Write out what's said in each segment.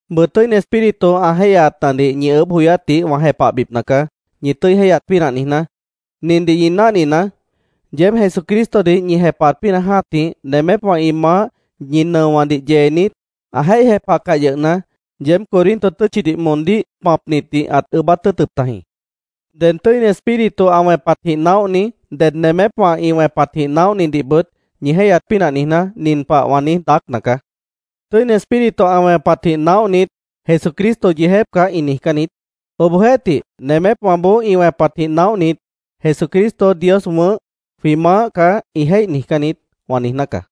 Bʉʉ Tʉ́ini Espíritu ã jéihyaatnadih ñi ʉʉ́bh joyátdih wã jepahbipna caá, ñi tʉ́i jéihyat pínah niijná. Nindih ñi náhninaá: Yeéb Jesucristodih ñi jepahat pínah jã́tih, nemépwã ĩ maáh ñi nʉowãdih yeenit, ã jéih jepahcah yʉhna, yeéb Corinto tʉ́tchidih moondíh pãpnitdih ãt ʉʉ́bát tʉ́ʉtʉp tajĩ. Ded Tʉ́ini Espíritu ã wẽpatjĩh naóhni, ded nemépwã ĩ wẽpatjĩh naóhnidihbʉt ñi jéihyat pínah niijná, nin pah wã niíj daácna caá: “Tʉ́ini Espíritu ã wẽpatjĩh naóhnit, ‘Jesucristo yeejép caá’, ĩ niijcán niít. Obohjeéhtih, nemépwãboó ĩ wẽpatjĩh naóhnit, ‘Jesucristo Dios wʉ̃ʉ́h, jwĩ Maáh caá’, ĩ jéih niijcán niít”, wã niijná caá.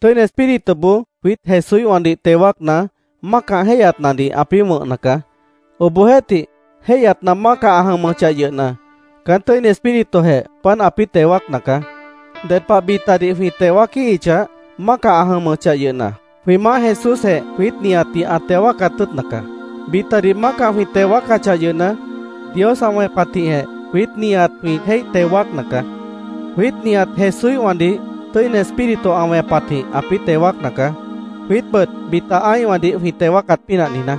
Tʉ́ini Espírituboó jwiít Jesúíhwãdih teo wáacna, mácah jéihyatnadih ãpĩ́ wʉ̃hna caá. Obohjeéhtih, jéihyatna mácah ã jʉmʉchah yʉhna, caán Tʉ́ini Espíritujeh páant ãpĩ́ teo wáacna caá. Ded pah bitadih jwĩ teo wáaquíhichah, mácah ã jʉmʉchah yʉhna, jwĩ Maáh Jesúsjeh jwiít nihatdih ã teo wáacat tʉ́ʉtna caá. Bitadih mácah jwĩ teo wáacachah yʉhna, Dios ã wẽpatjĩhjeh jwiít nihat jwĩ jéih teo wáacna caá. Jwiít nihat Jesúíhwãdih Tʉ́ini Espíritu ã wẽpatjĩh ãpĩ́ teo wáacna caá, jwiítbʉt bita ã́ihwãdih jwĩ teo wáacat pínah niijná.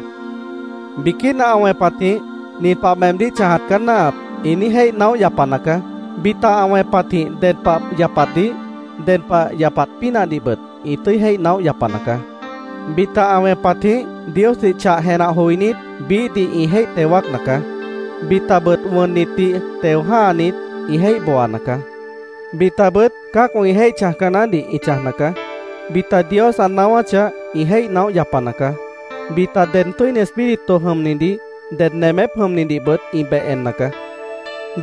Biquína ã wẽpatjĩh, “Nin pah meemdíh chãjat caá náahap”, ĩ niíj jéih naóh yapana caá. Bita ã wẽpatjĩh ded pah yapatdih, ded pah yapat pínahdihbʉt ĩ tʉ́i jéih naóh yapana caá. Bita ã wẽpatjĩh, Diosdih chah jenah joinít, biíhdih ĩ jéih teo wáacna caá. Bitabʉt wʉnnitdih teo jã́hanit, ĩ jéih booana caá. Bitabʉt cã́acwã ĩ jéih chãjca naáhdih ĩ chãjna caá. Bita Dios ã naáwáchah, ĩ jéih naóh yapana caá. Bita ded Tʉ́ini Espíritu jʉmnidih, ded nemép jʉmnidihbʉt ĩ beh enna caá.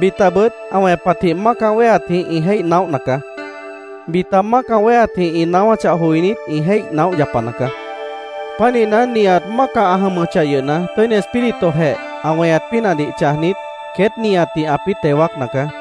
Bitabʉt ã wẽpatjĩh mácah wéheatjĩh ĩ jéih naóhna caá. Bita mácah wéheatjĩh ĩ naáwáchah joinít, ĩ jéih naóh yapana caá. Pánihna, nihat mácah ã jʉmʉchah yʉhna, Tʉ́ini Espíritujeh ã weñat pínahdih chãjnit, queét nihatdih ãpĩ́ teo wáacna caá.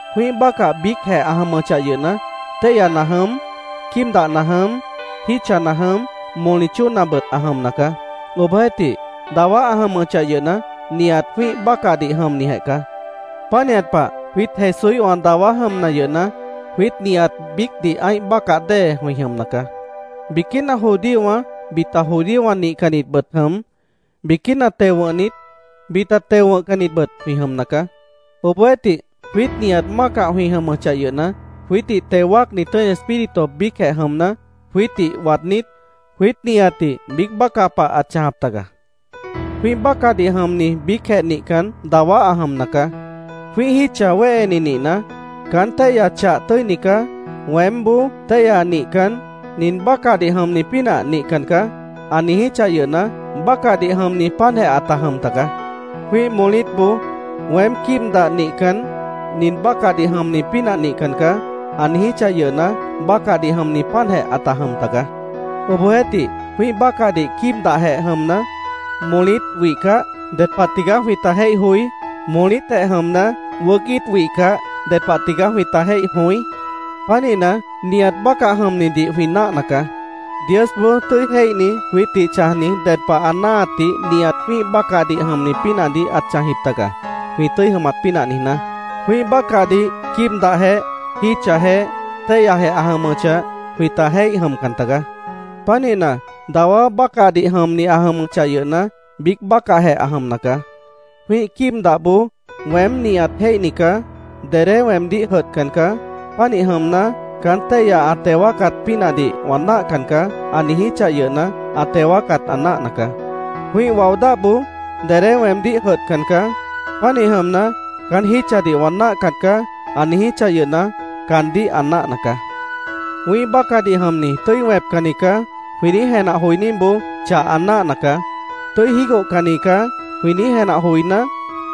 Jwĩ́ih bácah biícjeh ã jʉmʉchah yʉhna, téihyana jʉm, quíib dahna jʉm, jítchana jʉm, moli chóonabʉt ã jʉmna caá. Obohjeéhtih, dawá ã jʉmʉchah yʉhna, nihat jwĩ́ih bácahdih jʉmnijeh caá. Pánihat pah, jwiít Jesúíhwã dawá jʉmna yʉhna, jwiít nihat biícdih ã́ih bácah dée jwĩ jʉmna caá. Biquína judíowã, bita judíowã nihcannitbʉt jʉm, biquína teo wʉ̃hnit, bita teo wʉ̃hcannitbʉt jwĩ jʉmna caá. Obohjeéhtih, jwiít nihat mácah jwĩ jʉmʉchah yʉhna, jwiítdih teo wáacni Tʉ́ini Espíritu biícjeh jʉmna, jwiítdih waadnít, jwiít nihatdih biíc bácah pah ãt chãjap taga. Jwĩ́ih bácahdih jʉmni biícjeh nihcan, dawá ã jʉmna caá. Jwĩ́ih jítcha wéheni nihna, “Caán téihya chah tʉ́ini caá. Weémboó téihya nihcan, nin bácahdih jʉmni pínah nihcan caá”, ã niijíchah yʉhna, bácahdih jʉmni páantjeh ãta jʉm tagaá. Jwĩ́ih molítboó “Weém quíib dah nihcan, nin bácahdih jʉmni pínah nihcan caá”, ã niijíchah yʉhna, bácahdih jʉmni páantjeh ãta jʉm tagaá. Obohjeéhtih, jwĩ́ih bácahdih quíib dahjeh jʉmna, molít wihcah, ¿ded pah tigaá jwĩta jéih joí? Molítjeh jʉmna, wʉʉ́c íit wihcah, ¿ded pah tigaá jwĩta jéih jõí? Pánihna, nihat bácah jʉmnidih jwĩ náahna caá. Diosboó tʉ́i jéihni jwiítdih chãjni ded pah ã náahatdih nihat jwĩ́ih bácahdih jʉmni pínahdih ãt chãjjip taga, jwĩ tʉ́i jʉmat pínah niijná. Jwĩ́ih bácahdih quíib dahjeh, jítchajeh, téihyajeh ã jʉmʉchah, jwĩta jéih jʉmcan tagaá. Pánihna, dawá bácahdih jʉmni ã jʉmʉchah yʉhna, biíc bácahjeh ã jʉmna caá. Jwĩ́ih quíib dahboó “Weém nihat jéihni caá. Dedé weemdíh jʉdhcan caá. Pánih jʉmna, caán téihya ã teo wáacat pínahdih wã náahcan caá”, ã niijíchah yʉhna, ã teo wáacat ã náahna caá. Jwĩ́ih wao dáhboó “Dedé weemdíh jʉdhcan caá. Pánih jʉmna, caán jítchadih wã náahcan caá”, ã niijíchah yʉhna, caandíh ã náahna caá. “Wĩ́ih bácahdih jʉmni tʉ́i wẽpcanni caá”, jwĩ niíj jenah joiníboó chah ã náahna caá. “Tʉ́i jígohcanni caá”, jwĩ niíj jenah joiná,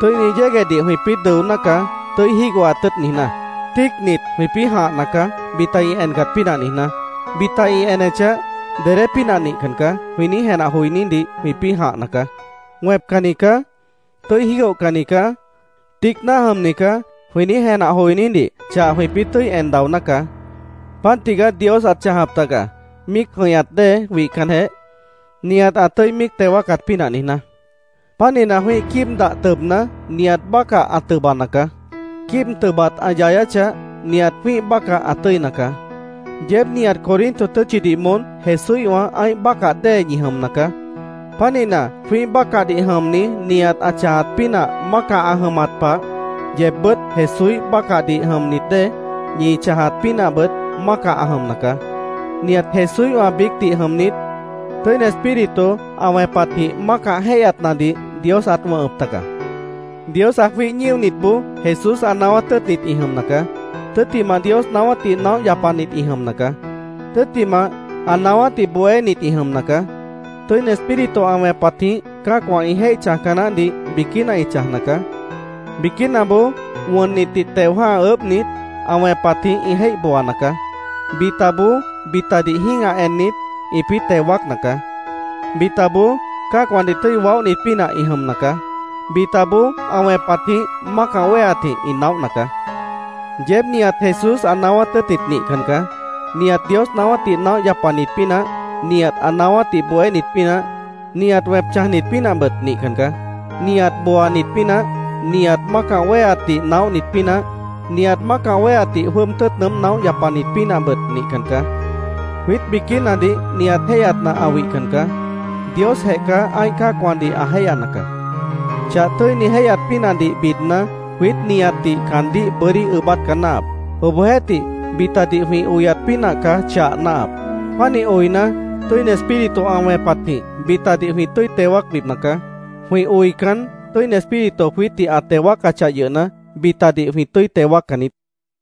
tʉ́ini yéguehdih jwĩpĩ́ dʉoná caá, tʉ́i jígohat tʉ́ʉt niijná. Tíicnit, jwĩpĩ́ jãhna caá, bita ĩ encat pínah niijná. “Bita ĩ enechah, dedé pínah nihcan caá”, jwĩ niíj jenah joinídih jwĩpĩ́ jãhcan caá. “Wẽpcanni caá. Tʉ́i jígohcanni caá. Tíic náah jʉmni caá”, jwĩ niíj jenah joinídih chah jwĩpĩ́ tʉ́i en daoná caá. Páant tigaá Dios ãt chãjap taga, míic jʉ̃ihñat dée wihcanjeh, nihat ã tʉ́i míic teo wáacat pínah niijná. Pánihna, jwĩ́ih quíib dah tʉbna, nihat bácah ã tʉbana caá. Quíib tʉbat ã yayáchah, nihat jwĩ́ih bácah ã tʉ́ina caá. Yeéb nihat Corinto tʉ́tchidih moón Jesúíhwã ã́ih bácah dée ñi jʉmna caá. Pánihna, jwĩ́ih bácahdih jʉmni nihat ã chãjat pínah mácah ã jʉmat pah, yeebbʉ́t Jesúíh bácahdih jʉmnit dée, ñi chãjat pínahbʉt mácah ã jʉmna caá. Nihat Jesúíhwã biícdih jʉmnit, Tʉ́ini Espíritu ã wẽpatjĩh mácah jéihyatnadih Dios ãt wʉ̃hʉp taga. Dios ã jwíih ñíonitboó Jesús ã naáwát tʉ́ʉtnit ĩ jʉmna caá. Tʉ́ttimah, Dios naáwátdih naóh yapanit ĩ jʉmna caá. Tʉ́ttimah, ã naáwátdih bohénit ĩ jʉmna caá. Tʉ́ini Espíritu ã wẽpatjĩh cã́acwã ĩ jéih chãjca naáhdih biquína ĩ chãjna caá. Biquínaboó wʉnnitdih teo jã́ha ʉʉ́bhnit, ã wẽpatjĩh ĩ jéih booana caá. Bitaboó, bitadih jĩ́gah ennit, ĩpĩ́ teo wáacna caá. Bitaboó, cã́acwãdih tʉ́i waóhnit pínah ĩ jʉmna caá. Bitaboó, ã wẽpatjĩh, mácah wéheatjĩh ĩ naóhna caá. Yeéb nihat Jesús ã naáwát tʉ́ʉtnit nihcan caá. Nihat Dios naáwátdih naóh yapanit pínah, nihat ã naáwátdih bohénit pínah, nihat wẽp chãjnit pínahbʉt nihcan caá. Nihat booanit pínah, nihat mácah wéheatdih naóhnit pínah, nihat mácah wéheatdih jwʉ́ʉb tʉ́ʉt nʉʉ́m naóh yapanit pínahbʉt nihcan caá. Jwiít biquínadih nihat jéihyatna ã wihcan caá. Diosjeh caá ã́ih cã́acwãdih ã jéihyana caá. Chah tʉ́ini jéihyat pínahdih bidna, jwiít nihatdih caandíh bʉ́dí ʉʉ́bát caá náahap. Obohjeéhtih, bitadih jwĩ oyat pínah caá chah náahap. Pánih oina, Tʉ́ini Espíritu ã wẽpatjĩh bitadih jwĩ tʉ́i teo wáacbipna caá. Jwĩ oican, Tʉ́ini Espíritu jwiítdih ã teo wáacachah yʉhna, bitadih jwĩ tʉ́i teo wáaccan niít.